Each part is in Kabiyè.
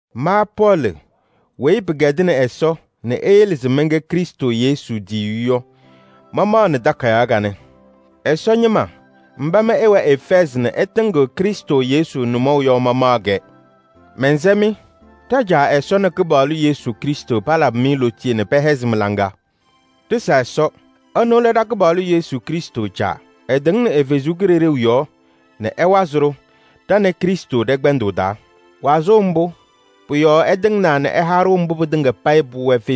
Ma Pɔɔlɩ weyi pɩkɛdɩnɩ Ɛsɔ nɛ eyele se mɛnkɛ Krɩstʋ Yesu tiyiyu yɔ, mamaɣnɩ takayaɣ kanɛ. Ɛsɔ ñɩma mba mɩ ɩwɛ Efɛɛzɩ nɛ ɩtɩŋɩɣ Krɩstʋ Yesu nʋmɔʋ yɔ mamaɣ-kɛ. Mɛnsɛ-mɩ: ɖa-Caa Ɛsɔ nɛ Kɩpaɣlʋ Yesu Krɩstʋ palabɩ-mɩ lootiye nɛ pɛhɛzɩ mɩ-laŋa. Ɖɩsa Ɛsɔ! Ɛnʋ lɛ ɖa-Kɩpaɣlʋ Yesu Krɩstʋ Caa. Ɛtɩŋnɩ ɛ-Kalɩzaɣ yɔɔ nɛ ɛwazɩ-ɖʋ wazʋʋ tɩŋa payɩ ɖa nɛ Krɩstʋ ɖɛ-kpɛndʋʋ taa, ɛsɔdaa pɩtɩŋa payɩ pʋwɛɛ.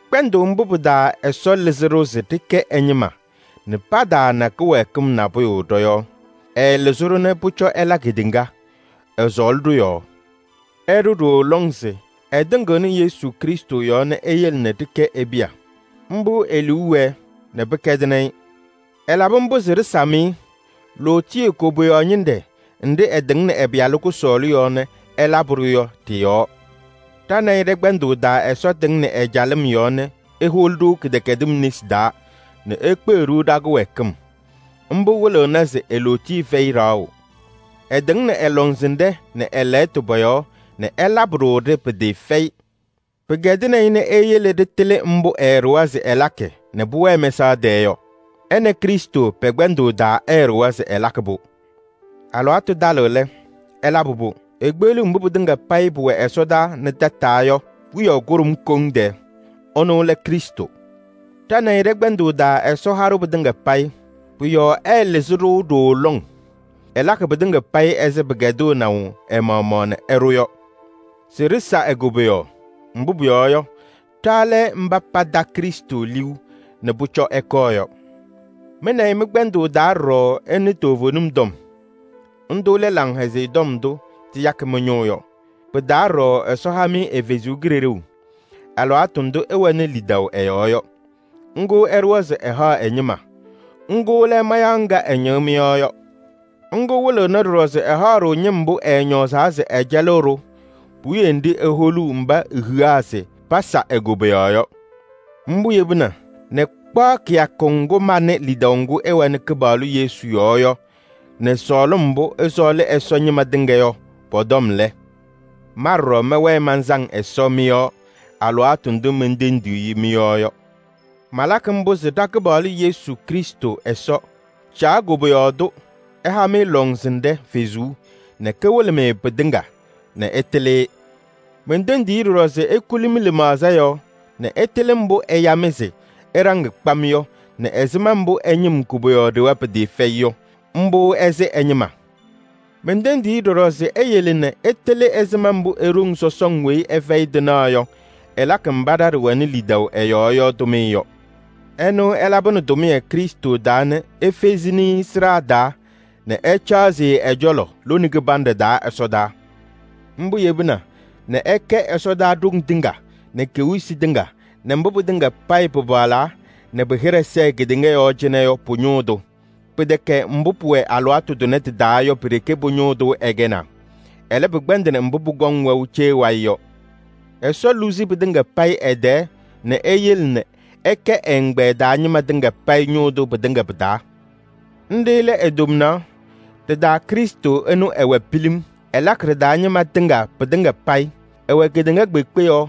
Kpɛndʋʋ mbʋ pɩ-taa Ɛsɔ lɩzɩ-ɖʋ se ɖɩkɛ ɛ-ñɩma nɛ pataana kɩwɛɛkɩm nabʋyʋ ɖɔ-yɔɔ. Ɛɛlɩzɩ-ɖʋ nɛ pʋcɔ ɛla kedeŋa. Ɛsɔɔlɩ-ɖʋ yɔɔ ɛɖʋ ɖooo lɔŋ se ɛtɩŋɩɣnɩ Yesu Krɩstʋ yɔɔ nɛ eyele ɖɩkɛ e-piya. Mbʋ e-liu wɛɛ, pɩkɛdɩnɩ-ɩ. Ɛlabɩ mbʋ se ɖɩsam-ɩ lootiye koboyaɣ ñɩnɖɛ nɖɩ ɛtɩŋnɩ ɛ-Pɩyalʋ kʋsɔɔlʋ yɔɔ nɛ ɛlabɩ-ɖʋ yɔ ɖɩ-yɔɔ. Ɖa nɛ ɩ ɖɛ-kpɛndʋʋ taa Ɛsɔ tɩŋnɩ ɛ-calɩm yɔɔ nɛ eholi-ɖʋ kɩdɛkɛdɩm nesi taa nɛ ekpeɣ-ɖʋ ɖa-kɩwɛɛkɩm. Mbʋ wɩlɩɣna se e-lootiye fɛyɩ ɖaɣʋ. Ɛtɩŋnɩ ɛ-lɔŋsɩnɖɛ nɛ ɛ-lɛɣtʋ pɔ-yɔɔ nɛ ɛlabɩ-ɖʋ-ɖɩ pɩtɩɩfɛyɩ. Pɩkɛdɩnɩ-ɩ nɛ eyele nɛ ɖɩtɩlɩ mbʋ ɛɛɖʋwa se ɛlakɩ nɛ pʋwɛɛ mɛsaɣ tɛɛ yɔ. Ɛ nɛ Krɩstʋ pɛ-kpɛndʋʋ taa ɛɛɖʋwa se ɛlakɩ-pʋ. Alɩwaatʋ talɩɣ lɛ, ɛlabɩ-pʋ: ekpeɣliɣ mbʋ pɩtɩŋa payɩ pʋwɛ ɛsɔdaa nɛ tataa yɔ wiyaʋ kʋɖʋm koŋ tɛɛ. Ɛnʋ lɛ Krɩstʋ. Ɖa nɛ ɩ ɖɛ-kpɛndʋʋ taa Ɛsɔ ha-ɖʋ pɩtɩŋa payɩ. Pʋ-yɔɔ ɛɛlɩzɩ-ɖʋ ɖooo lɔŋ. Ɛlakɩ pɩtɩŋa payɩ ɛzɩ pɩkɛdɩnaʋ ɛ-maɣmaɣ nɛ ɛɖʋ yɔ se ɖɩsa e-koboyaɣ. Mbʋ pʋyɔɔ yɔ, ɖa lɛ mba pata Krɩstʋ liu nɛ pʋcɔ ɛkɔɔ yɔ. Mɩ nɛ ɩ mɩ-kpɛndʋʋ taa ɖɔɖɔ ɩnɩ toovenim tɔm. Ndʋ lɛ Laŋhɛzɩyɛ Tɔm ndʋ tɩyakɩ mɩ-ñʋʋ yɔ. Pɩ-taa ɖɔɖɔ Ɛsɔ ha-mɩ ɛ-Kalɩzaɣ alɩwaatʋ ndʋ ɩwɛnɩ lidaʋ ɛ-yɔɔ yɔ. Ŋga ɛɖʋwa se ɛhaɣ ɛ-ñɩma. Ŋga lɛ mayaɣ ŋga ɛñɩɣ mɩ-yɔɔ yɔ. Ŋga wɩlɩɣnɩ ɖɔɖɔ se ɛhaɣ-ɖʋ ñɩm mbʋ ɛɛñɔɔzaa se ɛcɛlɩɣ-ɖʋ puwiye nɖɩ eholuu mba ehiɣa se pasa e-koboyaɣ yɔ. Mbʋ yebina nɛ kpaɣ kɩyakʋ ŋgʋ manɩ lidaʋ ŋgʋ ɩwɛnɩ Kɩpaɣlʋ Yesu yɔɔ yɔ nɛ sɔɔlɩm mbʋ ɩsɔɔlɩ Ɛsɔ ñɩma tɩŋa yɔ pɔ-tɔm lɛ, ma ɖɔɖɔ mɛwɛɛ mansaŋ Ɛsɔ mɩ-yɔɔ alɩwaatʋ ndʋ mentendiɣ-i mɩ-yɔɔ yɔ. Malakɩ mbʋ se ɖa-Kɩpaɣlʋ Yesu Krɩstʋ Ɛsɔ, Caa koboyaɣ tʋ ɛha-mɩ lɔŋsɩnɖɛ Kalɩzaɣ nɛ kawɩlɩ-mɩ pɩtɩŋa nɛ ɩtɩlɩ-ɩ. Mentendiɣ-i ɖɔɖɔ se ekuli mɩ-lɩmaɣza yɔɔ nɛ ɩtɩlɩ mbʋ ɛya-mɩ se ɩɖaŋ kpam yɔ nɛ ɛzɩma mbʋ ɛ-ñɩm koboyaɣ ɖewa pɩtɩɩfɛyɩ yɔ. Mbʋ ɛsɩ ɛ-ñɩma. Mentendiɣ-i ɖɔɖɔ se eyele nɛ ɩtɩlɩ ɛzɩma mbʋ e-ɖoŋ sɔsɔŋ weyi ɛfɛyɩ tɩnaɣ yɔ, ɛlakɩ mba ɖa ɖɩwɛnɩ lidaʋ ɛ-yɔɔ yɔ tʋmɩyɛ yɔ. Ɛnʋ ɛlabɩnɩ tʋmɩyɛ Krɩstʋ taa nɛ efezini-i sɩɖaa taa nɛ ɛcaɣzɩ-ɩ ɛ-cɔlɔ lone kɩbanɖɛ taa ɛsɔdaa. Mbʋ yebina nɛ ɛkɛ ɛsɔdaa ɖoŋ tɩŋa nɛ kewiyisi tɩŋa nɛ mbʋ pɩtɩŋa payɩ pɩpaɣlaa nɛ pɩ-hɩɖɛ sɛɛ kedeŋa yɔɔ cɩnɛ yɔ pʋ-ñʋʋ tʋ. Pɩtɛkɛ mbʋ pʋwɛ alɩwaatʋ tʋnɛ tɩ-taa yɔ pi-ɖeke pʋ-ñʋʋ tʋ ɛkɛnaa, ɛlɛ, pɩkpɛndɩnɩ mbʋ pʋkɔŋ wɛʋ cee wayɩ yɔ. Ɛsɔ luzi pɩtɩŋa payɩ ɛ-tɛɛ nɛ eyele nɛ ɛkɛ ɛ-ɛgbɛyɛ taa ñɩma tɩŋa payɩ ñʋʋ tʋ pɩtɩŋa pɩ-taa. Nɖɩ lɛ e-tomnaɣ. Ɖɩ-taa Krɩstʋ ɛnʋ ɛwɛɛ pilim: ɛlakɩ ɖɩ-taa ñɩma tɩŋa pɩtɩŋa payɩ. Ɛwɛ kedeŋa kpeekpe yɔɔ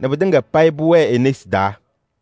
nɛ pɩtɩŋa payɩ pʋwɛɛ e-nesi taa.